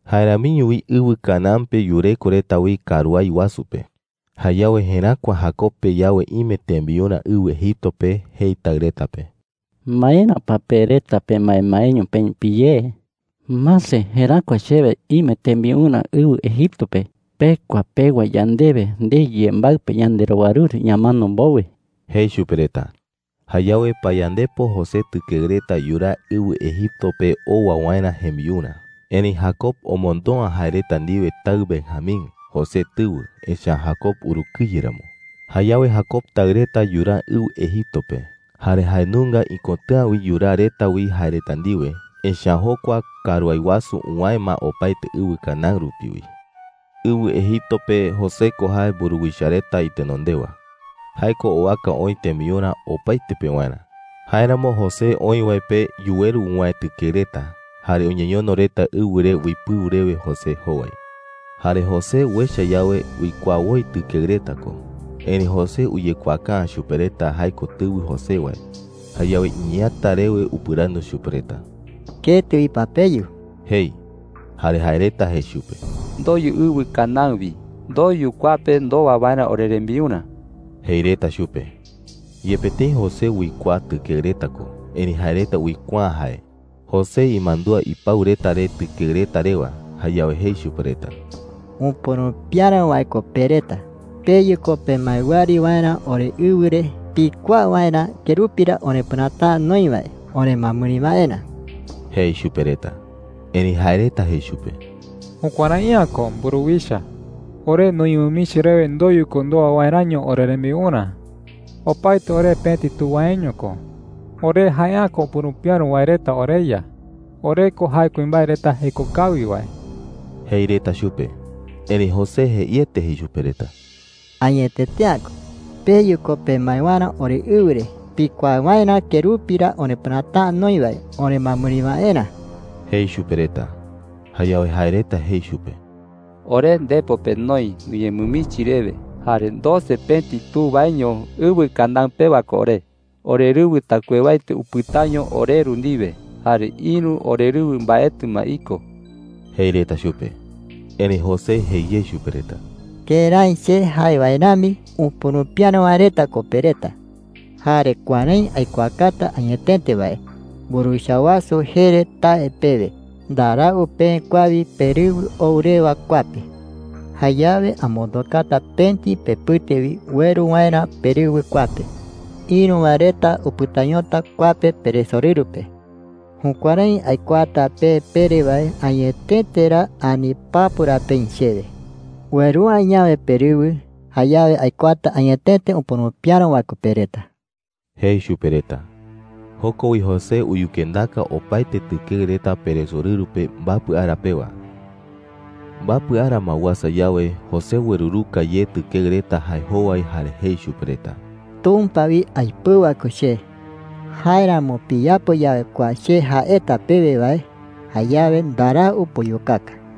Jae ramiño wi ɨwɨ Canaán pe yureko reta wi karuái wasu pe. Jayawe jeräkua Jacob pe yawe ime tembiurä ɨwɨ Egipto pe, jei taɨ reta pe: “¿Maera pa pe reta pemaemaeño peï piyé?” jei. “¡Mase! Jeräkua chewe ime tembiurä ɨwɨ Egipto pe. Pekua pewa yandewe ndei yembaɨ pe yanderowaruru ñamano mbowe,” jei chupe reta. Jayawe payandepo José tɨkeɨ reta yuraa ɨwɨ Egipto pe owa waerä jembiurä. Erëi Jacob omondo’ä jae reta ndiwe taɨ Benjamín, José tɨwɨ, echa’ä Jacob urukɨye ramo. Jayawe Jacob taɨ reta yuraa ɨwɨ Egipto pe. Jare jae nunga ikotɨ̈a wi yuraa reta wi jae reta ndiwe, echa’ä jokua karuái wasu uwäe ma opaete ɨwɨ Canaán rupi wi. Ɨwɨ Egipto pe José ko jae mburuwicha reta itenondewa. Jae ko owaka oï tembiurä opaete pewarä. Jáeramo José oï wae pe yuweru uwäe tɨkeɨ reta, jare uñeñono reta ɨwɨ re uipɨu rewe José jowai. Jare José uecha yawe, uikuaa woi tɨkeɨ reta ko. Erëi José uyekuaaka’ä chupe reta jae ko tɨwɨ José wae. Jayawe iñeeäta rewe upɨrandu chupe reta: “¿Ketɨ wi pa peyu?” jei. Jare jae reta jei chupe: “Ndoyu ɨwɨ Canaán wi. Ndoyu kua pe ndowa waerä orerembiurä,” jei reta chupe. Yepe tëi José uikuaa tɨkeɨ reta ko, erëi jae reta uikuaa’ä jae. José imandúa ipau reta re tɨkeɨ reta rewa. Jayawe jei chupe reta: “¡Upurupiäro wae ko pe reta! Peyu ko pemae wɨari waerä oreɨwɨ re, pikuaa waerä kerupi ra orepɨräta’ä noï wae oremɨamɨri waerä,” jei chupe reta. Erëi jae reta jei chupe: “Jukuärai’ä ko, mburuwicha,” jei. “Ore nuñemɨmichi rewe ndoyu ko ndowa waeräño orerembiurä. Opaete ore pëti tu waeño ko. Ore jae’ä ko upurupiäro wae reta, oreya. Ore ko jae kuimbae reta jeko kawi wae,” jei reta chupe. Erëi José jeiete jei chupe reta: “¡Añetete’ä ko! Peyu ko pemae waerä oreɨwɨ re, pikuaa waerä kerupi ra orepɨräta’ä noï wae oremɨamɨri waerä,” jei chupe reta. Jayawe jae reta jei chupe: “Ore ndepo pe noï nuñemɨmichi rewe, jare doce pëti tu waeño ɨwɨ Canaán pewa ko ore. Orerɨwɨ taɨkuewaete upɨtaño oreru ndiwe, jare ïru orerɨwɨ mbaetɨ ma iko,” jei reta chupe. Erëi José jei ye chupe reta: “¡Kërái che jae wae rami, upurupiäro wae reta ko pe reta!” jei. “Jare kuärái aikuaata añetete wae: Mburuwicha wasu jee re tae pewe, ndarau peë kua wi perɨwɨ ou rewa kua pe. Jayawe amondokata pëti pepɨte wi ueru waerä perɨwɨ kua pe. Ïru wae reta upɨtañota kua pe peresorɨru pe. Jukuärái aikuaata pe pere wae añetete ra ani papu ra peï chewe. Ueru’ä yawe perɨwɨ, jayawe aikuaata añetete upurupiäro wae reta ko pe reta,” jei chupe reta. Joko wi José uyukendaka opaete tɨkeɨ reta peresorɨru pe mbapɨ ara pewa. Mbapɨ ara ma uasa yawe, José ueruruka ye tɨkeɨ reta jae jowai jare jei chupe reta: “Tumpa wi aipɨu wae ko che. Jáeramo piyapo yawe kua che jaeta pewe wae, jayawe ndarau puyukaka,” jei chupe reta.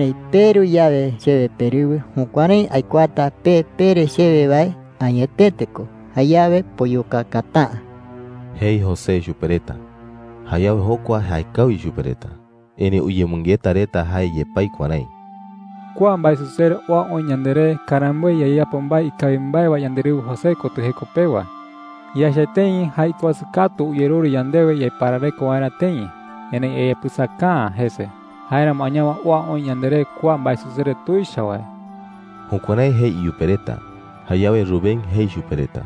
“Erëi peru yawe chewe perɨwɨ, jukuärái aikuaata pe pere chewe wae añetete ko. Jayawe puyukakata’ä,” jei José chupe reta. Jayawe jokua jaekawi chupe reta. Erëi uyemɨngeta reta jae yepái kuärái: “Kua mbaesusere oa oï yanderé karamboe yayapo mbae ikawi mbae wae yanderɨwɨ José kotɨ jeko pewa. Yaecha tëi jae ikuasɨ katu uyerure yandewe yaiparareko waerä tëi, erëi yayapɨsaka’ä jese. Jáeramo añawe oa oï yanderé kua mbaesusere tuicha wae.” Jukuärái jei iyupe reta. Jayawe Rubén jei chupe reta: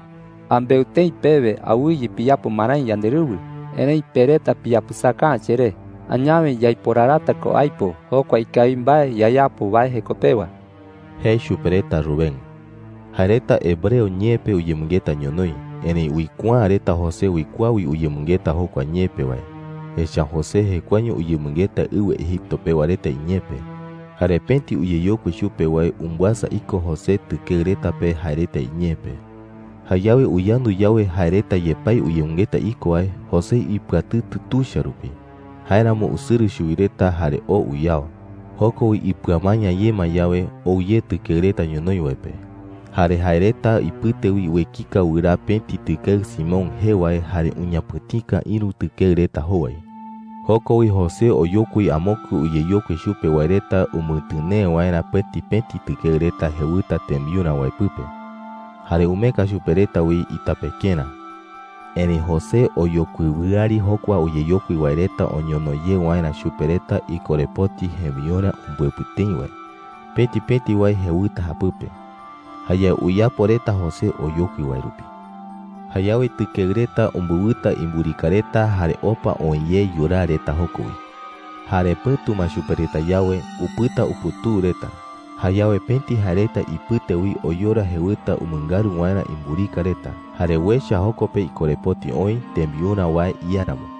“Ambeu tëi pewe awɨye piyapo marái yanderɨwɨ, erëi pe reta piyapɨsaka’ä cheré. Añawe yaiporarata ko aipo jokua ikawi mbae yayapo wae jeko pewa,” jei chupe reta Rubén. Jae reta hebreo ñee pe uyemɨngeta ñonoï, erëi uikuaa’ä reta José uikuaa wi uyemɨngeta jokua ñee pe wae. Echa’ä José jekuaeño uyemɨngeta ɨwɨ Egipto pewa reta iñee pe, jare pëti uyeyokui chupe wae umbɨasa iko José tɨkeɨ reta pe jae reta iñee pe. Jayawe uyandu yawe jae reta yepái uyemɨngeta iko wae, José ipɨatɨtɨ tuicha rupi. Jáeramo usɨrɨ chuwi reta jare oo uyao. Joko wi ipɨamaña ye ma yawe, ou ye tɨkeɨ reta ñonoï wae pe. Jare jae reta ipɨte wi uekika wɨraa pëti tɨkeɨ Simeón jee wae jare uñapɨ̈tika ïru tɨkeɨ reta jowai. Joko wi José oyokui amokue uyeyokui chupe wae reta umɨtɨnee waerä pëti pëti tɨkeɨ reta jewɨta tembiurä wae pɨpe. Jare umeeka chupe reta wi itapekerä. Erëi José oyokui wɨari jokua uyeyokui wae reta oñono ye waerä chupe reta ikorepoti jembiurä umbɨepɨ tëi wae, pëti pëti wae jewɨta japɨpe. Jayawe uyapo reta José oyokui wae rupi. Jayawe tɨkeɨ reta umbɨwɨta imburika reta jare opa oë ye yuraa reta joko wi. Jare pɨ̈tu ma chupe reta yawe, upɨta uputuu reta. Jayawe pëti jae reta ipɨte wi oyora jewɨta umɨngaru waerä imburika reta, jare uecha joko pe ikorepoti oï tembiurä wae iáramo.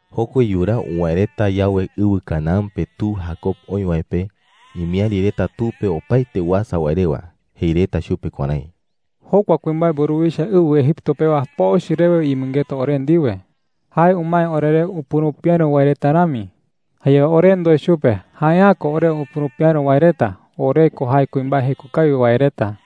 Joko wi yuraa uwäe reta yawe ɨwɨ Canaán pe tu Jacob oï wae pe, imiäri reta tu pe opaete uasa wae rewa. Jei reta chupe kuärái: “Jokua kuimbae mburuwicha ɨwɨ Egipto pewa pochɨ rewe uyemɨngeta ore ndiwe,” jei reta. “Jae umae oreré upurupiäro wae reta rami,” jei reta. “Jayawe ore ndoe chupe: ‘Jae’ä ko ore upurupiäro wae reta. Ore ko jae kuimbae jeko kawi wae reta.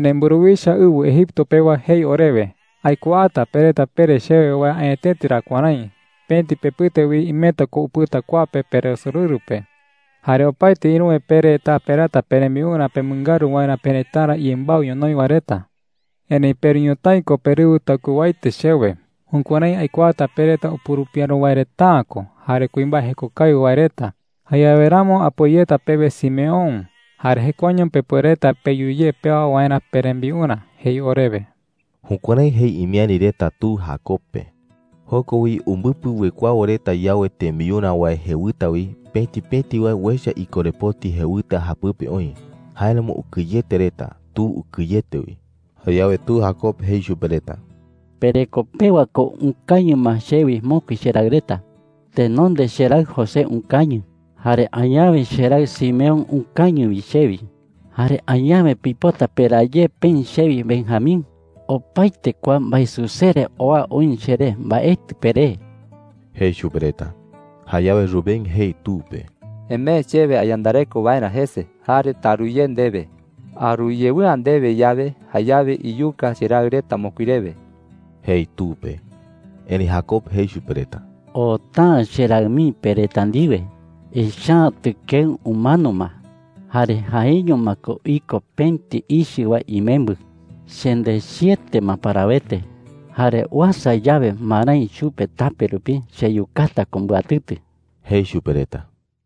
“Erëi mburuwicha ɨwɨ Egipto pewa jei orewe: ‘Aikuaata pe reta pere chewe wae añetete ra kuärái: Pëti pepɨte wi imeta ko upɨta kua pe peresorɨru pe. Jare opaete ïruwe pe reta peraata perembiurä pemɨngaru waerä perëtara iyembaɨ ñonoï wae reta. Erëi peru ñotái ko perɨwɨ taɨkuewaete chewe. Jukuärái aikuaata pe reta upurupiäro wae reta’ä ko jare kuimbae jeko kawi wae reta. Jayawe ramo apoi yeta pewe Simeón, jare jekuaeño pepuereta peyu ye pewa waerä perembiurä,’ jei orewe.” Jukuärái jei imiäri reta tu Jacob pe. Joko wi, umbɨpɨ uekuawo reta yawe tembiurä wae jewɨta wi, pëti pëti wae uecha ikorepoti jewɨta japɨpe oï. Jáeramo ukɨyete reta. Tu ukɨyete wi. Jayawe tu Jacob jei chupe reta: “Pereko pewa ko ukañɨ ma chewi mokui cheraɨ reta. Tenonde cheraɨ José ukañɨ, jare añawe cheraɨ Simeón ukañɨ wi chewi. Jare añawe pipota peraa ye peï chewi Benjamín. Opaete kua mbaesusere oa oï cheré, mbaetɨ peré,” jei chupe reta. Jayawe Rubén jei tu pe: “Emee chewe ayandareko waerä jese, jare taru ye ndewe. Aru yewɨ'ä ndewe yawe, jayawe iyuka cheraɨ reta mokui rewe,” jei tu pe. Erëi Jacob jei chupe reta: “Oota’ä cheraɨ mii pe reta ndiwe. Echa’ä tɨkeɨ umano ma, jare jaeño ma ko iko pëti ichɨ wae imembɨ. Chendechiete ma parawete, jare uasa yawe marái chupe tape rupi, cheyukata ko mbɨatɨtɨ,” jei chupe reta.